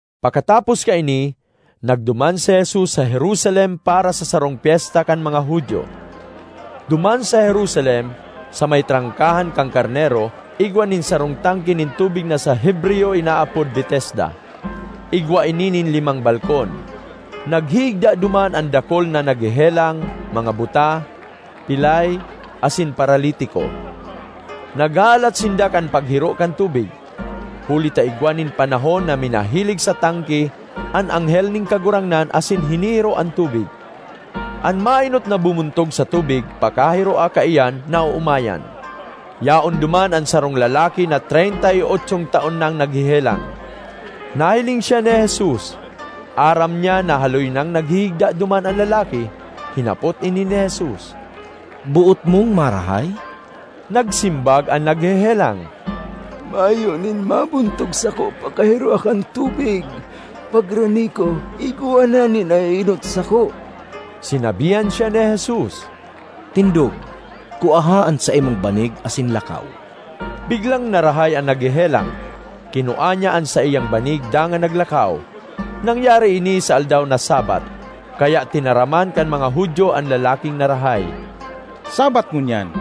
Pakatapos kaini, nagduman si Jesus sa Jerusalem para sa sarong pyesta kan mga Judio. Duman sa Jerusalem, sa may Trangkahan kan Karnero, igwa nin sarong tangke nin tubig na sa Hebreyo inaapod Betesda. Igwa ini nin limang balkon. Naghihigda duman an dakul na naghehelang—mga buta, pilay, asin paralitiko. Naghahalat sinda kan paghiro kan tubig, huli ta igwa nin panahon na minahilig sa tangke an anghel nin Kagurangnan asin hinihiro an tubig. An maenot na bumuntog sa tubig pakahiroa kaiyan, naoomayan. Yaon duman an sarong lalaki na treynta y otsong taon nang naghehelang. Nahiling siya ni Jesus; aram niya na haloy nang naghihigda duman an lalaki. Hinapot ini ni Jesus, “Boot mong marahay?” Nagsimbag an naghehelang, “Mayo nin mabuntog sako pakahiroa kan tubig; pagrani ko igwa na nin naeenot sako.” Sinabihan siya ni Jesus, “Tindog, kuaha an saimong banig asin lakaw.” Biglang narahay an naghehelang; kinua niya an saiyang banig dangan naglakaw. Nangyari ini sa aldaw na Sabbath. Kaya tinaraman kan mga Judio an lalaking narahay, “Sabbath ngunyan;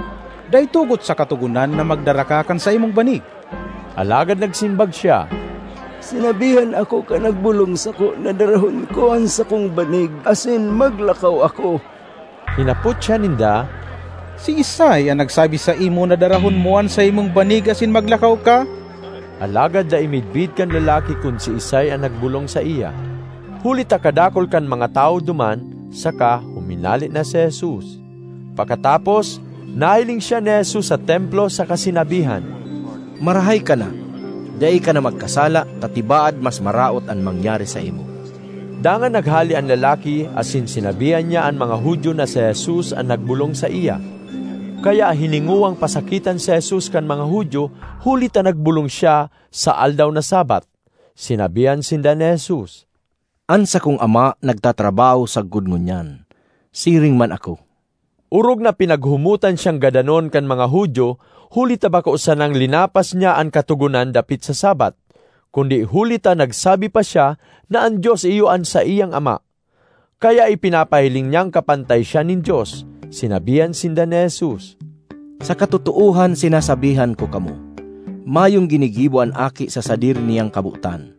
dai tugot sa Katogonan na magdara ka kan saimong banig.” Alagad nagsimbag siya, “Sinabihan ako kan nagbolong sako na darahon ko an sakong banig asin maglakaw ako.” Hinapot siya ninda, “Siisay an nagsabi saimo na darahon mo an saimong banig asin maglakaw ka?” Alagad dai midbid kan lalaki kun siisay an nagbolong saiya, huli ta kadakul kan mga tawo duman saka huminale na si Jesus. Pakatapos, nahiling siya ni Jesus sa Templo saka sinabihan, “Marahay ka na! Dai ka na magkasala, ta tibaad mas maraot an mangyari saimo.” Dangan naghale an lalaki asin sinabihan niya an mga Judio na si Jesus an nagbolong saiya. Kaya hiningowang pasakitan si Jesus kan mga Judio huli ta nagbolong siya sa aldaw na Sabbath. Sinabihan sinda ni Jesus, “An sakong Ama nagtatrabaho sagkod ngunyan; siring man ako.” Orog na pinaghumotan siyang gadanon kan mga Judio huli ta bako sanang linapas niya an katogonan dapit sa Sabbath, kundi huli ta nagsabi pa siya na an Dios iyo an saiyang Ama; kaya ipinapahiling niyang kapantay siya nin Dios. Sinabihan sinda ni Jesus, “Sa katotoohan sinasabihan ko kamo, mayong ginigibo an Aki sa sadiri niyang kabotan;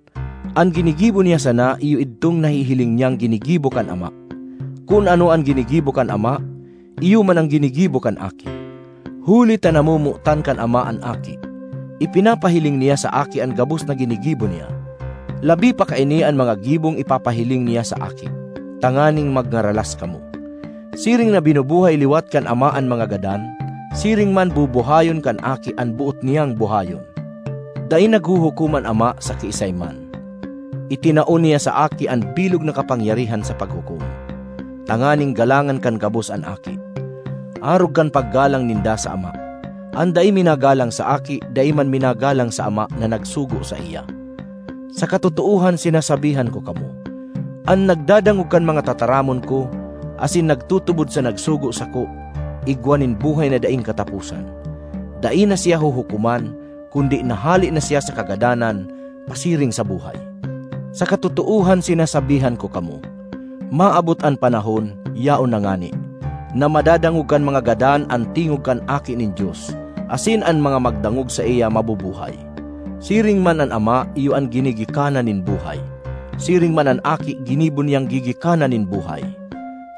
an ginigibo niya sana iyo idtong nahihiling niyang ginigibo kan Ama. Kun ano an ginigibo kan Ama, iyo man an ginigibo kan Aki. Huli ta namomotan kan Ama an Aki, ipinapahiling niya sa Aki an gabos na ginigibo niya. Labi pa kaini an mga gibong ipapahiling niya sa Aki, tanganing magngaralas kamo. Siring na binubuhay liwat kan Ama an mga gadan, siring man bubuhayon kan Aki an boot niyang buhayon. Dai naghuhukom an Ama sa kiisay man. Itinao niya sa Aki an bilog na kapangyarihan sa paghukom, tanganing galangan kan gabos an Aki, arog kan paggalang ninda sa Ama. An dai minagalang sa Aki dai man minagalang sa Ama na nagsugo saiya. ”Sa katotoohan sinasabihan ko kamo, an nagdadangog kan mga tataramon ko, asin nagtutubod sa nagsugo sako, igwa nin buhay na daing kataposan. Dai na siya huhukoman kundi nahale na siya sa kagadanan pasiring sa buhay. Sa katotoohan sinasabihan ko kamo, maabot an panahon—yaon na ngani—na madadangog kan mga gadan an tingog kan Aki nin Dios asin an mga magdangog saiya mabubuhay. Siring man an Ama iyo an ginigikanan nin buhay; siring man an Aki ginibo niyang gigikanan nin buhay.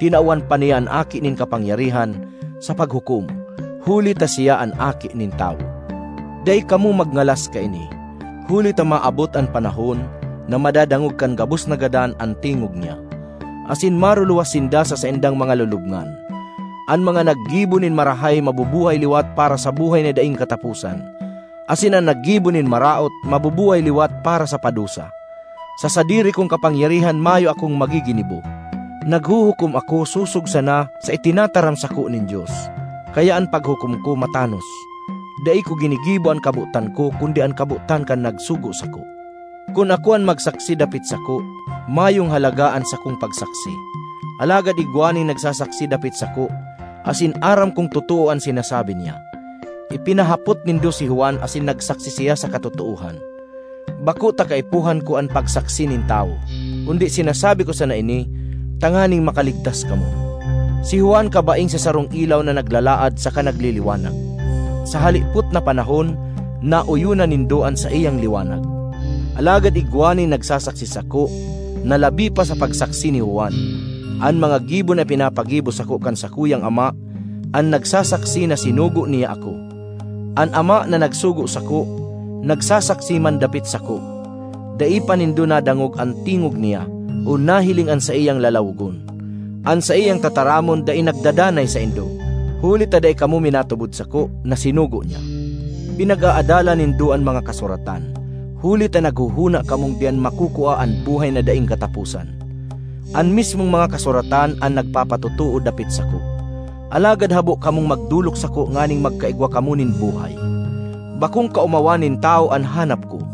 Tinawan pa niya an Aki nin kapangyarihan sa paghukom, huli ta siya an Aki nin Tawo. Dai kamo magngalas kaini, huli ta maabot an panahon na madadangog kan gabos na gadan an tingog niya asin maruluwas sinda sa saindang mga lulubngan: an mga naggibo nin marahay mabubuhay liwat para sa buhay na daing kataposan, asin an naggibo nin maraot mabubuhay liwat para sa padusa. ”Sa sadiri kong kapangyarihan mayo akong magiginibo. Naghuhukom ako sosog sana sa itinataram sako nin Dios, kaya an paghukom ko matanos; dai ko ginigibo an kabotan ko kundi an kabotan kan nagsugo sako. ”Kun ako an magsaksi dapit sako, mayong halaga an sakong pagsaksi. Alagad igwa nin nagsasaksi dapit sako asin aram kong totoo an sinasabi niya. Ipinahapot nindo si Juan asin nagsaksi siya sa katotoohan. Bako ta kaipuhan ko an pagsaksi nin tawo, kundi sinasabi ko sana ini tanganing makaligtas kamo. Si Juan kabaing sa sarong ilaw na naglalaad saka nagliliwanag. Sa halipot na panahon naoyonan nindo an saiyang liwanag. Alagad igwa nin nagsasaksi sako na labi pa sa pagsaksi ni Juan: an mga gibo na ipinapagibo sako kan sakuyang Ama an nagsasaksi na sinugo niya ako. An Ama na nagsugo sako nagsasaksi man dapit sako. Dai pa nindo nadangog an tingog niya o nahiling an saiyang lalawogon. An saiyang tataramon dai nagdadanay saindo, huli ta dai kamo minatubod sako na sinugo niya. Pinag-aadalan nindo an mga Kasuratan, huli ta naghohona kamong diyan makukua an buhay na daing kataposan. An mismong mga kasuratan an nagpapatotoo dapit sako! Alagad habo kamong magdolok sako nganing magkaigwa kamo nin buhay. ”Bakong kaomawan nin tawo an hanap ko.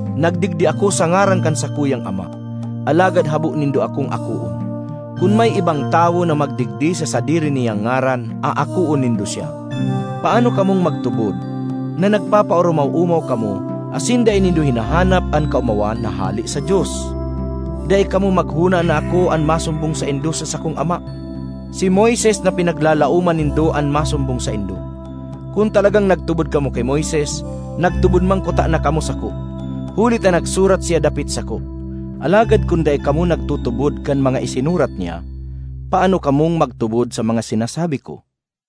Nagdigdi ako sa ngaran kan sakuyang Ama, alagad habo nindo akong akoon. Kun may ibang tawo na magdigdi sa sadiri niyang ngaran, aakoon nindo siya. Paano kamong magtubod na nagpapaoromaw-omaw kamo asin dai nindo hinahanap an kaomawan na hale sa Dios? Dai kamo maghona na ako an masumbong saindo sa sakong Ama; si Moises na pinaglalaoman nindo an masumbong saindo. Kun talagang nagtubod kamo ki Moises, nagtubod man kutana kamo sako, huli ta nagsurat siya dapit sako. Alagad kun dai kamo nagtutubod kan mga isinurat niya, paano kamong magtubod sa mga sinasabi ko?”